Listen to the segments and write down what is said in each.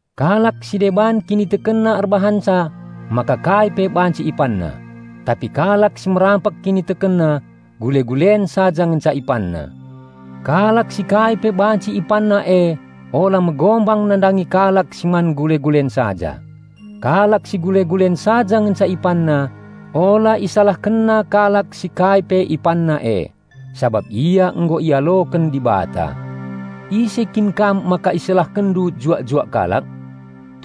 Kalak si deban kinitekenna erbahanca maka kai pe banci ipanna, tapi kalak si merampek kinitekenna gule-gulen saja ngenca ipanna. Kalak si kai pe banci ipanna e ula megombang nandangi kalak si man gule-gulen saja; kalak si gule-gulen saja ngenca ipanna ula isalahkenna kalak si kai pe ipanna e, sabap ia nggo ialoken Dibata. Ise kin kam maka isalahkenndu juak-juak kalak?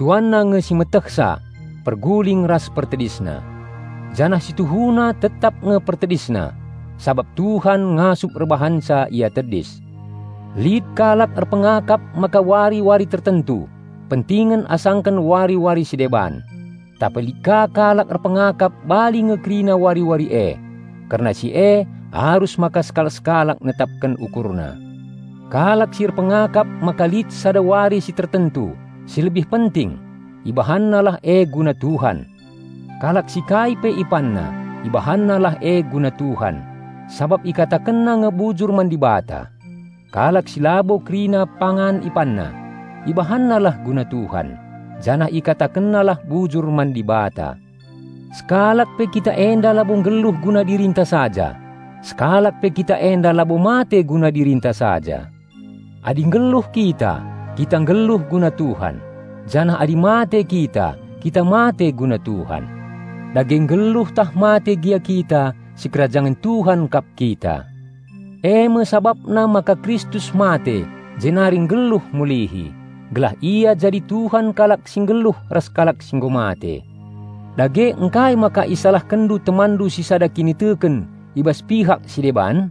Tuanna nge si metehsa perguling ras pertedisna. Janah si tuhuna tetap nge pertedisna, sabap Tuhan ngasup erbahanca ia tedis. Lit kalak erpengakap maka wari-wari tertentu pentingen asaken wari-wari si deban, tapi lit ka kalak erpengakap bali nge kerina wari-wari e. Kerna si e arus maka sekalak-sekalak netapken ukurna. Kalak si erpengakap maka lit sada wari si tertentu si lebih penting, ibahannalah e guna Tuhan. Kalak si kai pe ipanna, ibahannalah e guna Tuhan, sabap ikatakenna nge bujur man Dibata. Kalak si labo kerina pangan ipanna, ibahannalah guna Tuhan, janah ikatakennalah bujur man Dibata. Sekalak pe kita enda labo nggeluh guna dirinta saja; sekalak pe kita enda labo mate guna dirinta saja. Adi nggeluh kita, kita nggeluh guna Tuhan, janah adi mate kita, kita mate guna Tuhan. Dage nggeluh tah mate gia kita, sikerajangen Tuhan kap kita. Eme sabapna maka Kristus mate jenari mulihi, gelah Ia jadi Tuhan kalak si nggeluh ras kalak si nggo mate. Dage ngkai maka isalahkenndu temanndu si sada kiniteken i bas pihak si deban?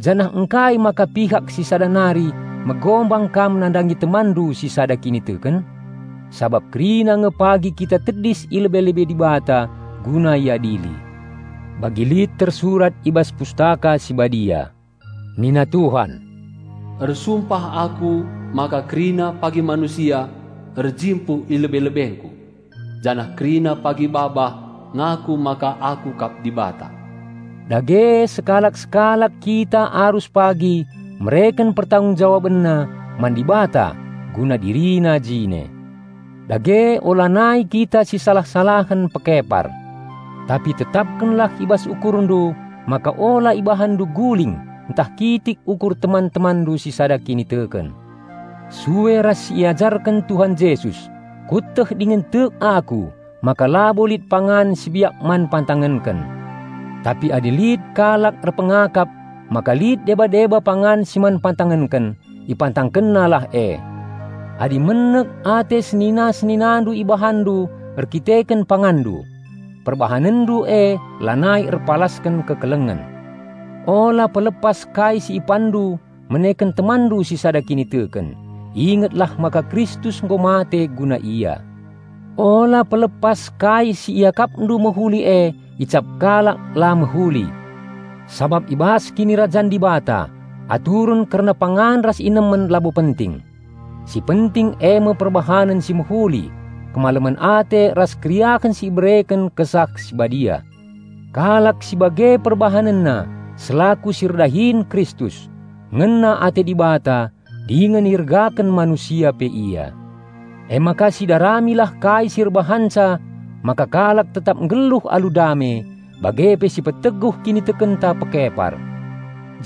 Janah ngkai maka pihak si sada nari megombang kam nandangi temanndu si sada kiniteken? Sabap kerina nge pagi kita tedis i lebe-lebe Dibata guna iadili. Bagi lit tersurat i bas Pustaka Si Badia, "Nina Tuhan, 'Ersumpah Aku maka kerina pagi manusia erjimpuh i lebe-lebengKu,' janah kerina pagi babah ngaku maka Aku kap Dibata." Dage sekalak-sekalak kita arus pagi mereken pertanggungen jawabenna man Dibata guna dirina jine. Dage ulanai kita sisalah-salahen pekepar. Tapi tetapkenlah i bas ukurndu maka ula ibahanndu guling ntah kitik ukur teman-temanndu si sada kiniteken. Sue ras si iajarken Tuhan Jesus kueteh dingen tek aku maka labo lit pangan si biak man pantangenken; tapi adi lit kalak erpengakap maka lit deba-deba pangan si man pantangenken, ipantangkennalah e. Adi menek ate senina-seninandu ibahanndu erdandanken panganndu, perbahanenndu e lanai erpalasken kekelengen. Ula pelepas kai si ipanndu meneken temanndu si sada kiniteken; ingetlah maka Kristus nggo mate guna ia. Ula pelepas kai si iakapndu mehuli e icap kalak la mehuli. Sabap i bas Kinirajan Dibata, aturen kerna pangan ras inemen labo penting. Si penting eme perbahanen si mehuli, kemalemen ate ras keriahen si ibereken Kesah Si Badia. Kalak si bage perbahanenna selaku si erdahin Kristus, ngena ate Dibata dingen iergaken manusia pe ia. Emaka sidaramilah kai si erbahanca maka kalak tetap nggeluh alu dame bage pe si peteguh kinitekenta pekepar.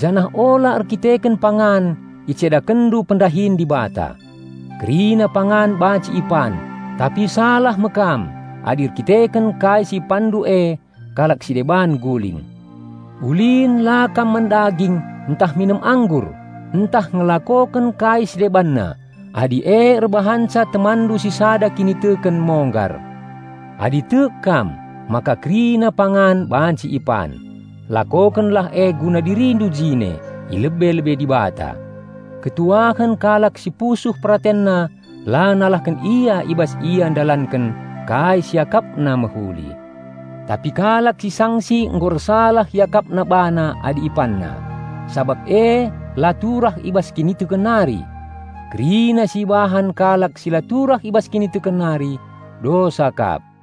Janah ula erdandanken pangan icedakenndu pendahin Dibata. Kerina pangan banci ipan tapi salah me kam adi erdandanken kai si ipanndu e kalak si deban guling. Ulin la kam man daging ntah minem anggur ntah ngelakoken kai si debanna adi e erbahanca temanndu si sada kiniteken monggar. Adi tek kam maka kerina pangan banci ipan, lakokenlah e guna dirindu jine i lebe-lebe Dibata. Malem me ate kalak si pusuh peratenna la nalahken ia i bas ia ndalanken kai si iakapna mehuli. Tapi kalak si sangsi nggo ersalah iakapna bana adi ipanna, sabap e la turah i bas kiniteken nari. Kerina si ibahan kalak si la turah i bas kiniteken nari, dosa kap.